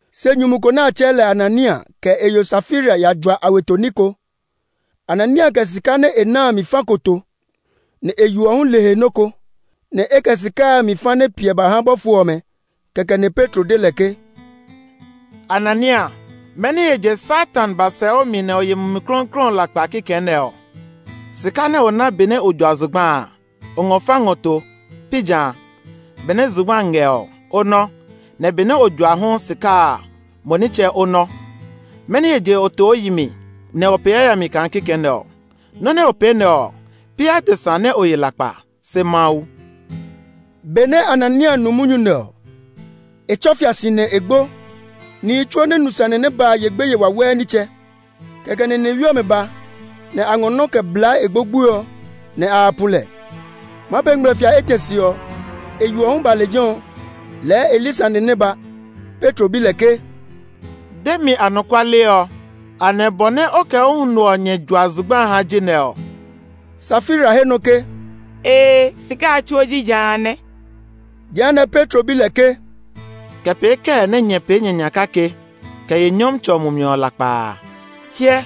Se nyumu ko nɛ a tsɛɛ lɛ Anania, kɛ e yo Safira ya jua a weto ní ko. Anania kɛ sika nɛ a na a mi fa ko to, nɛ e yo ɔ hu le he nɔ ko. Nɛ e kɛ sika a mi fa nɛ piɛ ba ha bɔfo ɔmɛ. Kɛkɛ nɛ Petro de lɛ ke, “Anania, mɛni he je Satan ba sɛ o mi nɛ o ye Mumi Klɔuklɔu ɔ lakpa kikɛ nɛ ɔ? Sika nɛ o na benɛ o jua zugba a, o ngɔ fa ngɔ to, pi jã? Benɛ zugba a ngɛ ɔ, o nɔ́; nɛ benɛ o jua a hu sika a mo nitsɛ o nɔ́. Mɛni he je o to o yi mi, nɛ o pee yayami kaa kikɛ nɛ ɔ? Nɔ́ nɛ o pee nɛ ɔ, pi adesa nɛ o ye lakpa, se Mawu!” Benɛ Anania nu munyu nɛ ɔ, e tsɔ fia si, nɛ e gbo. Nihi tsuo nɛ nu sane nɛ ba a ye gbeye wawɛɛ nitsɛ. Kɛkɛ nɛ nihewi ɔmɛ ba, nɛ a ngɔ nɔ́ kɛ blaa e gbogboe ɔ, nɛ a ya pu lɛ. Maa pee ngmlɛfia etɛ se ɔ, e yo ɔ hu ba lejɛ ɔ; lɛɛ e li sane nɛ ba. Petro bi lɛ ke, “De mi anɔkuale ɔ; anɛ bɔ nɛ o kɛ o huno ɔ nyɛ jua zugba a ha ji nɛ ɔ?” Safira he nɔ ke, “Ee, sika a tsuo ji ja a nɛ.” Jehanɛ Petro bi lɛ ke, “Kɛ pee kɛɛ nɛ nyɛ pee nyɛ nya kake kɛ ye Nyɔmtsɛ ɔ Mumi ɔ lakpa a, nyɛ susu kaa nyɛ maa ye nyɛ he lo? Hyɛ,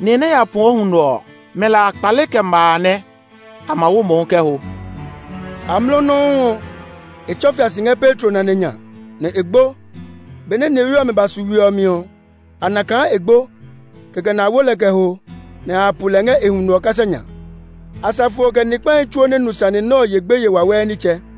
nihi nɛ ya pu o huno ɔ, mɛ lɛ a kpale kɛ ma a nɛ; a ma wo mo hu kɛ ho!” Amlɔ nɔuu ɔ, e tsɔ fia si ngɛ Petro nane nya, nɛ e gbo. Benɛ nihewi ɔmɛ ba su we ɔ mi ɔ, a na kaa e gbo; kɛkɛ nɛ a wo lɛ kɛ ho, nɛ a ya pu lɛ ngɛ e huno ɔ kasa nya. Asafo ɔ, kɛ ni kpahi tsuo nɛ nu sane nɛ ɔ ye gbeye wawɛɛ nitsɛ.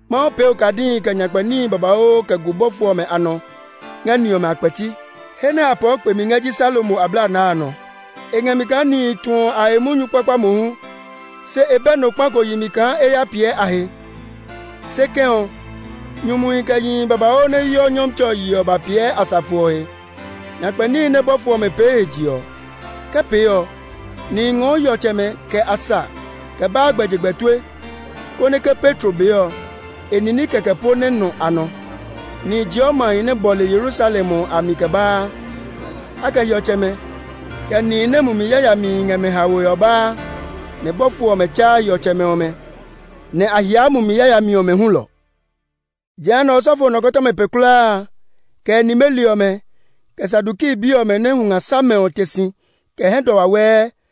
Mawu pee okadihi, kɛ nyakpɛ níhi babauu kɛ gu bɔfo ɔmɛ a nɔ ngɛ ni ɔmɛ a kpɛti. He nɛ a pɔɔ kpemi ngɛ ji Salomo Ablanaa a nɔ. E ngɛ mi kaa nihi tuɔ a he munyu kpakpa mohu, se e bɛ nɔ kpa ko yi mi kaa e ya piɛ a he. Se kɛ̃ ɔ, nyumuhi, kɛ yihi babauu nɛ heɔ Nyɔmtsɛ ɔ yeɔ ɔ ba piɛ asafo ɔ he. Nyakpɛ níhi nɛ bɔfo ɔmɛ pee he je ɔ, ke pee ɔ, nihi ngɔɔ hiɔtsɛmɛ kɛ a sa kɛ baa gbɛjegbɛ tue, konɛ ke Petro bee ɔ, e nini kɛkɛ po nɛ nɔ a nɔ. Nihi jeɔ mahi nɛ bɔle Yerusalem ɔ a mi kɛ baa. A kɛ hiɔtsɛmɛ, kɛ nihi nɛ mumi yayamihi ngɛ mɛ haoe ɔ baa, nɛ bɔfo ɔmɛ tsaa hiɔtsɛmɛ ɔmɛ, nɛ a hiaa mumi yayami ɔmɛ hulɔ. Jehanɛ osɔfo nɔkɔtɔma pe kulaa a, kɛ e nimeli ɔmɛ, kɛ Saduki bi ɔmɛ nɛ hunga sa mɛ ɔ te si kɛ hɛdɔ wawɛɛ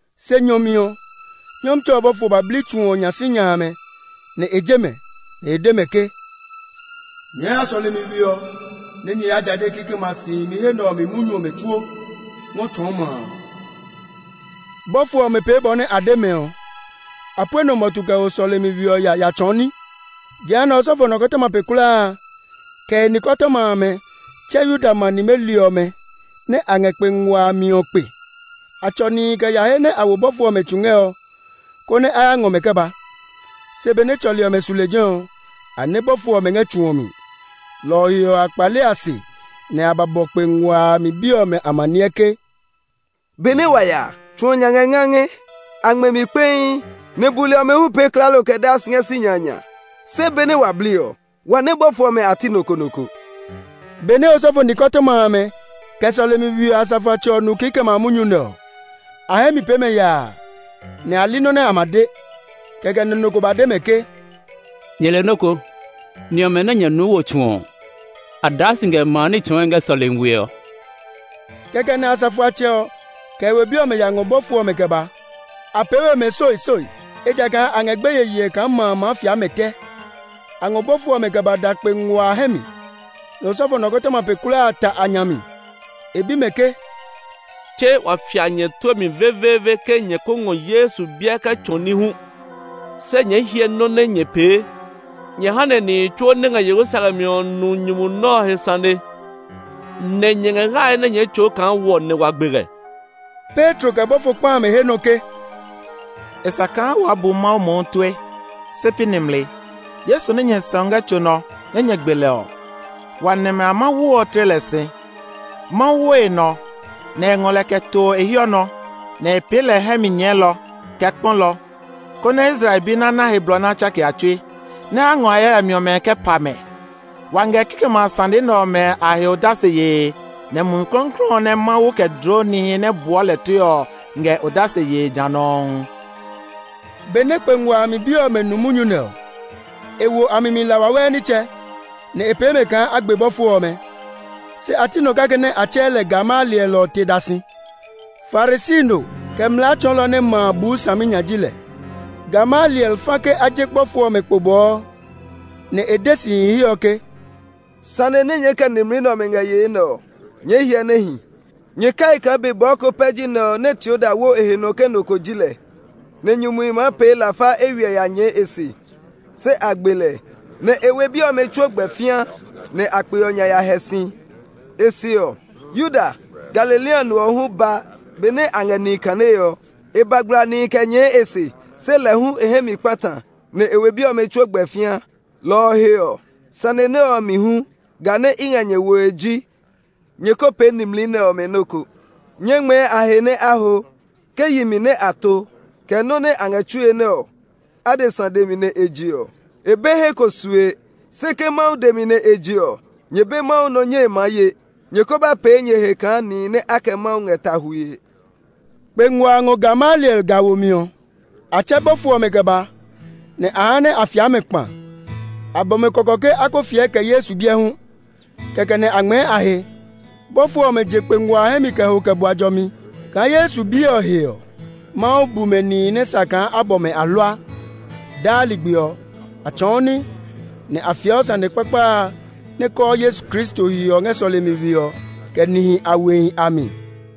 Se nyɔ mi ɔ, Nyɔmtsɛ ɔ bɔfo ba bli tsu ɔ nya sinya amɛ, nɛ e je mɛ; nɛ e de mɛ ke, “Nyɛɛ ya sɔlemi we ɔ nɛ nyɛ ya jaje kikɛmɛ a si himi he nɛ ɔ mi munyu ɔmɛ tsuo ngɔ tsɔɔ ma a.” Bɔfo ɔmɛ pee bɔ nɛ a de mɛ ɔ. A pue nɔ mɔtu kɛ ho sɔlemi we ɔ ya ya tsɔɔ ní. Jehanɛ osɔfo nɔkɔtɔma pe kulaa a, kɛ e nikɔtɔma amɛ tsɛ Yuda ma nimeli ɔmɛ nɛ a ngɛ kpe ngua a mi ɔ kpe. A tsɔ nihi kɛ ya he nɛ a wo bɔfo ɔmɛ tsu ngɛ ɔ, konɛ a ya ngɔ mɛ kɛ ba. Se benɛ tsɔli ɔmɛ su lejɛ ɔ, a nɛ bɔfo ɔmɛ ngɛ tsu ɔ mi. Lɔ ɔ he ɔ, a kpale a se nɛ a ba bɔ kpe ngua a mi bi ɔmɛ amaniɛ ke, “Benɛ wa ya a, tsu ɔ nya ngɛ ngangɛ. A ngmɛ mi kpɛii, nɛ buli ɔmɛ hu pee klaalo kɛ daa si ngɛ sinya a nya. Se benɛ wa bli ɔ, wa nɛ bɔfo ɔmɛ a ti nɔ ko nɔ ko!” Benɛ osɔfo nikɔtɔma amɛ, kɛ sɔlemi we ɔ asafoatsɛ ɔ nu kikɛmɛ a munyu nɛ ɔ, a hɛ mi pee mɛ yaa, nɛ a li nɔ nɛ a ma de. Kɛkɛ nɛ nɔ ko ba de mɛ ke, “Nyɛ le nɔ́ ko! Ni ɔmɛ nɛ nyɛ nuu wo tsu ɔ, a daa si ngɛ ma a ní tsɔɔe ngɛ sɔlemi we ɔ.” Kɛkɛ nɛ asafoatsɛ ɔ, kɛ e we bi ɔmɛ ya ngɔ bɔfo ɔmɛ kɛ ba. A pee we mɛ soisoi, ejakaa a ngɛ gbeye yee kaa ma a maa fia mɛ tɛ. A ngɔ bɔfo ɔmɛ kɛ ba da kpe ngua a hɛ mi, nɛ osɔfo nɔkɔtɔma pe kulaa a ta a nya mi. E bi mɛ ke, “Tse wa fia nyɛ tue mi veveeve ke nyɛ ko ngɔ Yesu biɛ kɛ tsɔɔ ní hu? Se nyɛɛ hyɛ nɔ́ nɛ nyɛ pee! Nyɛ ha nɛ nihi tsuo nɛ ngɛ Yerusalem ɔ nu nyumu nɛ ɔ he sane nɛ nyɛ ngɛ hlae nɛ nyɛɛ tsɔɔ kaa wɔ nɛ wa gbe lɛ!” Petro, kɛ bɔfo kpa amɛ he nɔ ke, “E sa kaa waa bu Mawu mohu tue, se pi nimli. Yesu nɛ nyɛ sɛu ngɛ tso nɔ nɛ nyɛ gbe lɛ ɔ, wa nɛmɛ a Mawu ɔ tle lɛ si. Mawu wo e nɔ, nɛ e ngɔ lɛ kɛ to e hiɔ nɔ, nɛ e pee lɛ hɛ mi nyɛɛlɔ, kɛ kpɔlɔ, konɛ Israel bi nɛ a ná he blɔ nɛ a tsake a tsui, nɛ a ngɔ a he yayami ɔmɛ kɛ pa mɛ. Wa ngɛ kikɛmɛ a sane nɛ ɔmɛ a he odase yee; nɛ Mumi Klɔuklɔu ɔ nɛ Mawu kɛ dloo nihi nɛ buɔ lɛ tue ɔ ngɛ odase yee ja nɔuu.” Benɛ kpe ngua a mi bi ɔmɛ nu munyu nɛ ɔ, e wo a mi mi la wawɛɛ nitsɛ, nɛ e pee mɛ kaa a gbe bɔfo ɔmɛ. Se a ti nɔ kake nɛ a tsɛɛ lɛ Gamaliel ɔ te da si. Farisi no, kɛ mlaa tsɔɔlɔ nɛ ma a buu saminya ji lɛ. Gamaliel fa ke a je bɔfo ɔmɛ kpo bɔɔ; nɛ e de sihi he ɔ ke, “Sane nɛ nyɛɛ kɛ nimli nɛ ɔmɛ ngɛ yee nɛ ɔ, nyɛɛ hyɛ saminya. Nyɛ kai kaa be bɔɔ ko pɛ ji nɛ nɛ Teuda wo e he nɔ ke nɔ ko ji lɛ, nɛ nyumuhi maa pee lafa eywiɛ ya nyɛɛ e se. Se a gbe lɛ, nɛ e we bi ɔmɛ tsuo gbɛ fĩa nɛ a kpe ɔ nya ya hɛ si. E se ɔ, Yuda, Galilea no ɔ hu ba benɛ a ngɛ nihi kanee ɔ. E ba gbla nihi kɛ nyɛɛ e se, se lɛ hu e hɛ mi kpata, nɛ e we bi ɔmɛ tsuo gbɛ fĩa. Lɔ ɔ he ɔ, sane nɛ ɔ mi hu, ga nɛ i ngɛ nyɛ woe ji nyɛ ko pee nimli nɛ ɔmɛ nɔ́ ko; nyɛɛ ngmɛɛ a he nɛ a ho. Ke yi mi nɛ a to, kɛ nɔ́ nɛ a ngɛ tsue nɛ ɔ, adesa dɛ mi nɛ e je ɔ, e be he ko sue. Se ke Mawu dɛ mi nɛ e je ɔ, nyɛ be Mawu nɔ nyɛe maa ye. Nyɛ ko ba pee nyɛ he kaa nihi nɛ a kɛ Mawu ngɛ ta hwue!” Kpe ngua a ngɔ Gamaliel ga womi ɔ. A tsɛ bɔfo ɔmɛ kɛ ba, nɛ a ha nɛ a fia mɛ kpa. A bɔ mɛ kɔkɔ hulɔ ke a ko fiɛ kɛ Yesu biɛ hu; kɛkɛ nɛ a ngmɛɛ a he. Bɔfo ɔmɛ je kpe ngua a hɛ mi kɛ ho kɛ bua jɔmi kaa Yesu biɛ ɔ he ɔ, Mawu bu mɛ nihi nɛ sa kaa a bɔ mɛ ahlua. Daa ligbi ɔ, a tsɔɔ ní, nɛ a fiɛɔ sane kpakpa a nɛ kɔɔ Yesu Kristo he ɔ ngɛ sɔlemi we ɔ, kɛ nihi a wehi a mi.